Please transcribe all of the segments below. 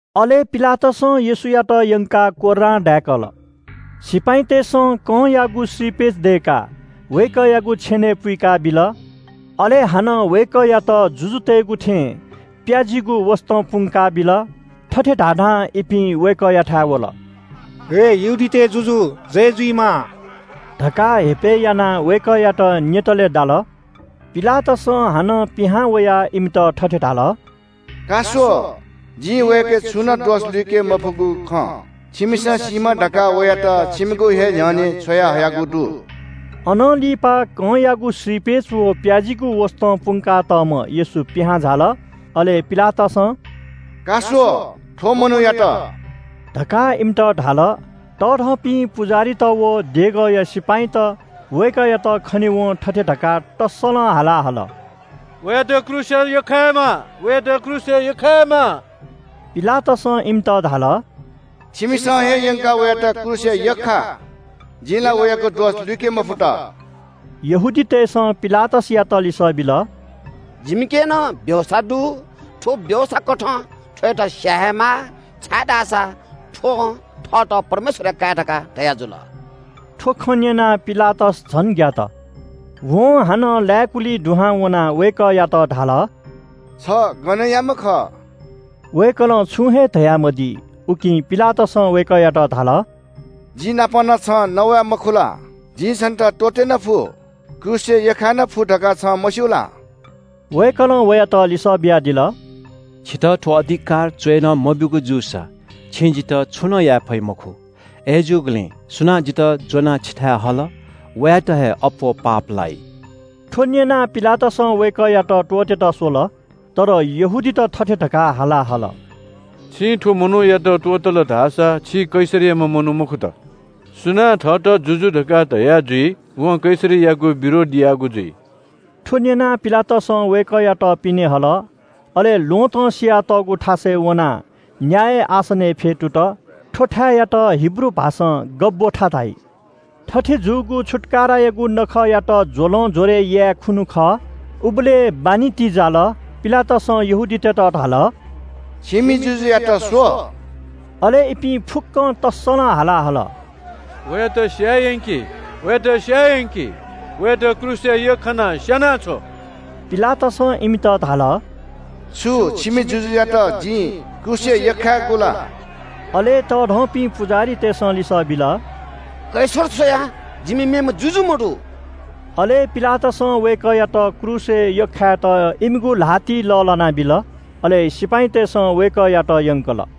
अले पिलातसं येशूयात यंकाः कोर्रां दाय्‌कल। सिपाइँतय्‌सं कंयागु श्रीपेच दय्‌काः वय्‌कःयागु छेनय् पुइकाबिल। अले हानं वय्‌कःयात जुजुतय्‌गु थें प्‍याजीगु वसतं पुंका बिल। थथे धाधां इपिं वय्‌कःयाथाय् वल “हे यहूदीतय् जुजु, जय जुइमा” धकाः हेपय् यानाः वय्‌कःयात न्‍यतालय् दाल। पिलातसं हानं पिहां वयाः इमित थथे धाल – “का स्‍व, जिं वयाके छुनं दोष लुइके मफुगु खँ छिमिसं सीमा धकाः वयात छिमिगु हे न्‍ह्यःने छ्वयाहयागु दु।” अनं लिपा कंयागु श्रीपेच व प्‍याजीगु वसतं पुंकातःम्‍ह येशू पिहां झाल। अले पिलातसं – “का स्‍व, थ्‍व मनूयात” धकाः इमित धाल। तःधंपिं पुजाहारीत व देगःया सिपाइँत वय्‌कःयात खनेवं थथे धकाः तस्‍सलं हाला हल – “वयात क्रूसय् यख्‍खायेमाः, वयात क्रूसय् यख्‍खायेमाः।” पिलातसं इमित धाल – “छिमिसं हे यंकाः वयात क्रूसय् यख्‍खा। जिं ला वयागु दोष लुइके मफुत।” यहूदीतय्‌सं पिलातसयात लिसः बिल – “जिमिके नं व्‍यवस्‍था दु, थ्‍व व्‍यवस्‍थाकथं थ्‍वयात स्‍याये हे माः, छाय्‌धाःसा थ्‍वं थःत परमेश्‍वरया काय् धकाः धयाजुल।” थ्‍व खँ न्‍यनाः पिलातस झन ग्‍यात। वं हानं लाय्‌कुलिइ दुहां वनाः वय्‌कःयात धाल – “छ गनयाम्‍ह खः?” वय्‌कलं छुं हे धयामदी। उकिं पिलातसं वय्‌कःयात धाल “जि नाप नं छं नवाये मखु ला? जिं छन्‍त त्‍वःते नं फु, क्रूसय् यख्‍खाये नं फु धकाः छं मस्‍यू ला?” वय्‌कलं वयात लिसः बियादिल – “छितः थ्‍व अधिकार च्‍वय्‌नं मब्‍यूगु जूसा छिं जितः छुं नं याये फइ मखु। अय्‌जूगुलिं सुनां जितः ज्‍वनाः छिथाय् हल, वयात हे अप्‍वः पाप लाइ।” थ्‍व न्‍यनाः पिलातसं वय्‌कःयात त्‍वःतेत स्‍वल। तर यहूदीत थथे धकाः हाला हल – “छिं थ्‍व मनूयात त्‍वःतल धाःसा छि कैसरया मनू मखुत। सुनां थःत जुजु धकाः धया जुइ वं कैसरयागु विरोध याःगु जुइ।” थ्‍व न्‍यनाः पिलातसं वय्‌कःयात पिने हल, अले ल्‍वहँतं सियातःगु थासय् वनाः न्‍याय आसनय् फ्‍यतुत। थ्‍व थाय्‌यात हिब्रू भाषां “गब्‍बथा” धाइ। थथे जूगु छुत्‍काराया नखःयात ज्‍वलं ज्‍वरय् याये खुन्‍हु खः। उबलय् बान्‍हि ति जाल। पिलातसं यहूदीतय्‌त धाल – “छिमि जुजुयात स्‍व।” अले इपिं फुक्‍कं तस्‍सलं हाला हल – “वयात स्‍याये यंकि, वयात स्‍याये यंकि, वयात क्रूसय् यख्‍खानाः स्‍यानाछ्व।” पिलातसं इमित धाल – “छु छिमि जुजुयात जिं क्रूसय् यख्‍खायेगु ला?” अले तःधंपिं पुजाहारीतय्‌सं लिसः बिल – “कैसर स्‍वया जिमि मेम्‍ह जुजु मदु।” अले पिलातसं वय्‌कःयात क्रूसय् यख्‍खायेत इमिगु ल्‍हातिइ लःल्‍हाना बिल। अले सिपाइँतय्‌सं वय्‌कःयात यंकल।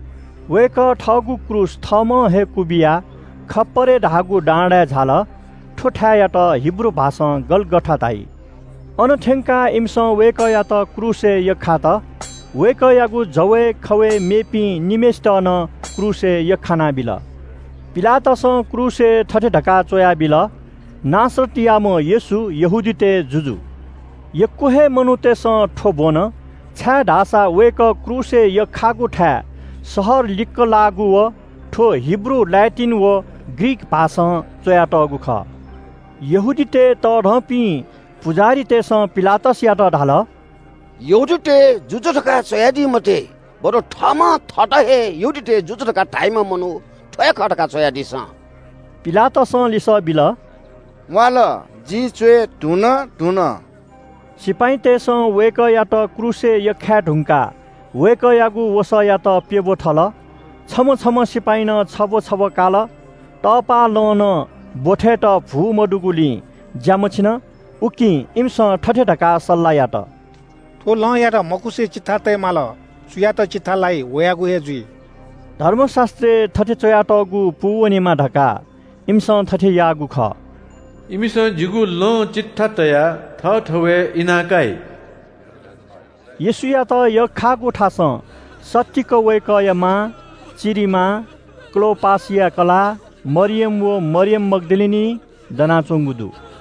वय्‌कः थःगु क्रूस थःम्‍हं हे क्‍वबिया खप्‍परे धाःगु डाँडाय् झाल। थ्‍व थाय्‌यात हिब्रू भाषां “गलगथा” धाइ। अन थ्‍यंकाः इमिसं वय्‌कःयात क्रूसय् यख्‍खात। वय्‌कःयागु जवय् खवय् मेपिं निम्‍हय्‌सित नं क्रूसय् यख्‍खानाबिल। पिलातसं क्रूसय् थथे धकाः च्‍वयाबिल – “नासरतयाम्‍ह येशू, यहूदीतय् जुजु।” यक्‍व हे मनूतय्‌सं थ्‍व ब्‍वन छाय्‌धाःसा वय्‌कः क्रूसय् यख्‍खाःगु थाय् शहर लिक्‍क लाःगु, व थ्‍व हिब्रू, ल्‍याटिन व ग्रीक भाषां च्‍वयातःगु खः। यहूदीतय् तःधंपिं पुजाहारीतय्‌सं पिलातसयात धाल – “यहूदीतय् जुजु धकाः च्‍वयादी मते, बरु थःम्‍हं थःत हे यहूदीतय् जुजु धकाः धाइम्‍ह मनू थ्‍व हे खः धकाः च्‍वयादिसँ।” पिलातसं लिसः बिल – “म्‍वाःल, जिं च्‍वये धुन।” सिपाइँतय्‌सं वय्‌कःयात क्रूसय् यख्‍खाये धुंकाः वय्‌कःयागु वसःयात प्‍यब्‍व थल। छम्‍ह छम्‍ह सिपाइँनं छब्‍व छब्‍व काल। तपाःलं नं ब्‍वथय्‌त भू मदुगुलिं ज्‍या मछिन। उकिं इमिसं थथे धकाः सल्‍लाह यात – “थ्‍व लंयात मखुसे चिट्ठा तये माल, सुयात चिट्ठा लाइ वयागु हे जुइ।” धर्मशास्‍त्रय् थथे च्‍वयातःगु पूवनेमा धकाः इमिसं थथे याःगु खः – “इमिसं जिगु लं चिट्ठा तयाः थःथवय् इनाकाइ।” येशूयात यख्‍खाःगु थासं सत्तीक वय्‌कःया मां, चिरिमां, क्‍लोपासया कलाः मरियम व मरियम मग्‍दलिनी दनाच्‍वंगु दु।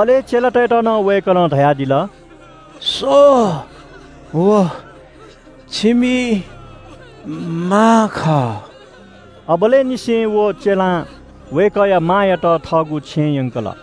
अले चेलायात नं वय्‌कलं धयादिल – “स्‍व, व छिमि मां खः!” अबलय् निसें व चेलां वय्‌कःया मांयात थःगु छेँय् यंकल।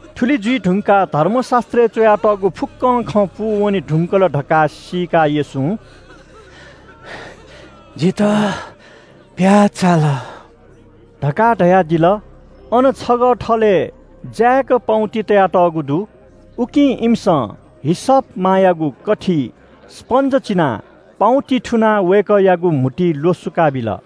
थुलि जुइ धुंकाः धर्मशास्‍त्रय् च्‍वयातःगु फुक्‍कं खँ पूवने धुंकल धकाः सीकाः येशूं “जितः प्‍याः चाल” धकाः धयादिल। अन छगः थलय् जाय्‌क पाउँति तयातःगु दु। उकिं इमिसं हिसप मायागु कथिइ स्‍पन्‍ज चिनाः पाउँतिइ थुनाः वय्‌कःयागु म्‍हुतुइ ल्‍वसुकाबिल।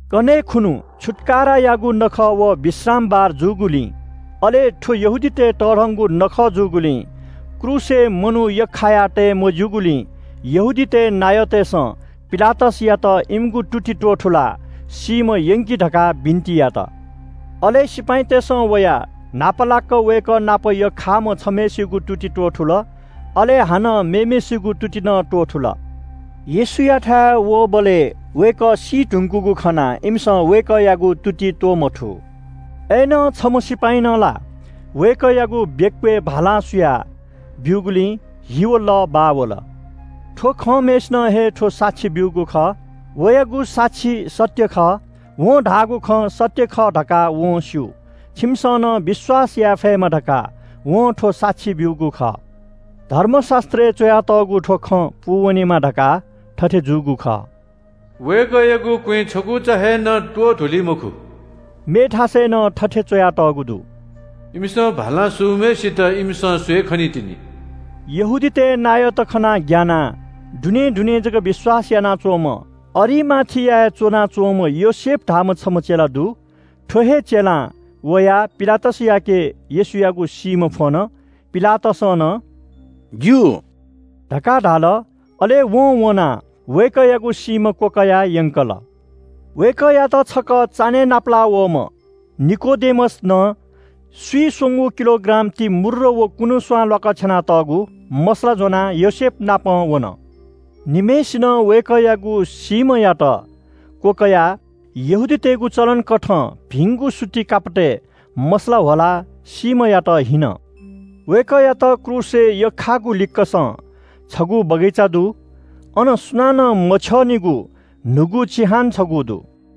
कन्‍हय् खुन्‍हु छुत्‍कारायागु नखः व विश्रामबार जूगुलिं अले थ्‍व यहूदीतय् तःधंगु नखः जूगुलिं, क्रूसय् मनू यख्‍खाया तये मज्‍यूगुलिं यहूदीतय् नायःतय्‌सं पिलातसयात इमिगु तुति त्‍वथुलाः सीम्‍ह यंकि धकाः बिन्‍ति यात। अले सिपाइँतय्‌सं वयाः न्‍हापालाक वय्‌कः नाप यख्‍खाःम्‍ह छम्‍हय्‌सिगु तुति त्‍वथुल, अले हानं मेम्‍हय्‌सिगु तुति नं त्‍वथुल। येशूयाथाय् वःबलय् वय्‌कः सी धुंकूगु खनाः इमिसं वय्‌कःयागु तुति त्‍वमथू। अय्‌नं छम्‍ह सिपाइँनं ला वय्‌कःयागु बेक्‍वय् भालां सुया ब्‍यूगुलिं हि व लः बाः वल। थ्‍व खंम्‍हय्‌सिनं हे थ्‍व साक्षी ब्‍यूगु खः। वयागु साक्षी सत्‍य खः। वं धाःगु खँ सत्‍य खः धकाः वं स्‍यू। छिमिसं नं विश्‍वास याये फयेमा धकाः वं थ्‍व साक्षी ब्‍यूगु खः। धर्मशास्‍त्रय् च्‍वयातःगु थ्‍व खँ पूवनेमा धकाः थथे जूगु खः – “वय्‌कःयागु क्‍वँय् छकुचा हे नं त्‍वधुली मखु।” मेथासय् नं थथे च्‍वयातःगु दु – “इमिसं भालां सूम्‍हय्‌सित इमिसं स्‍वये खनीतिनि।” यहूदीतय् नायःत खनाः ग्‍यानाः दुनें दुनें जक विश्‍वास यानाच्‍वंम्‍ह अरिमाथियाय् च्‍वनाच्‍वंम्‍ह योसेफ धाःम्‍ह छम्‍ह चेला दु। थ्‍व हे चेलां वयाः पिलातसयाके येशूयागु सीम्‍ह फ्‍वन। पिलातसं नं “ज्‍यू” धकाः धाल। अले वं वनाः वय्‌कःयागु सीम्‍ह क्‍वकयाः यंकल। वय्‌कःयात छकः चान्‍हय् नापलाःवःम्‍ह निकोदेमस नं स्‍विस्‍वँगू किलोग्राम ति मूर्र व कुनुस्‍वां ल्‍वाकछ्यानातःगु मसला ज्‍वनाः योसेफनापं वन। निम्‍हय्‌सिनं वय्‌कःयागु सीम्‍हयात क्‍वकयाः यहूदीतय्‌गु चलन कथं भिंगु सुति कापतय् मसला ह्वलाः सीम्‍हयात हीन। वय्‌कःयात क्रूसय् यख्‍खाःगु लिक्‍कसं छगू बगैँचा दु। अन सुनानं मछ्यःनिगु न्‍हूगु चिहान छगू दु।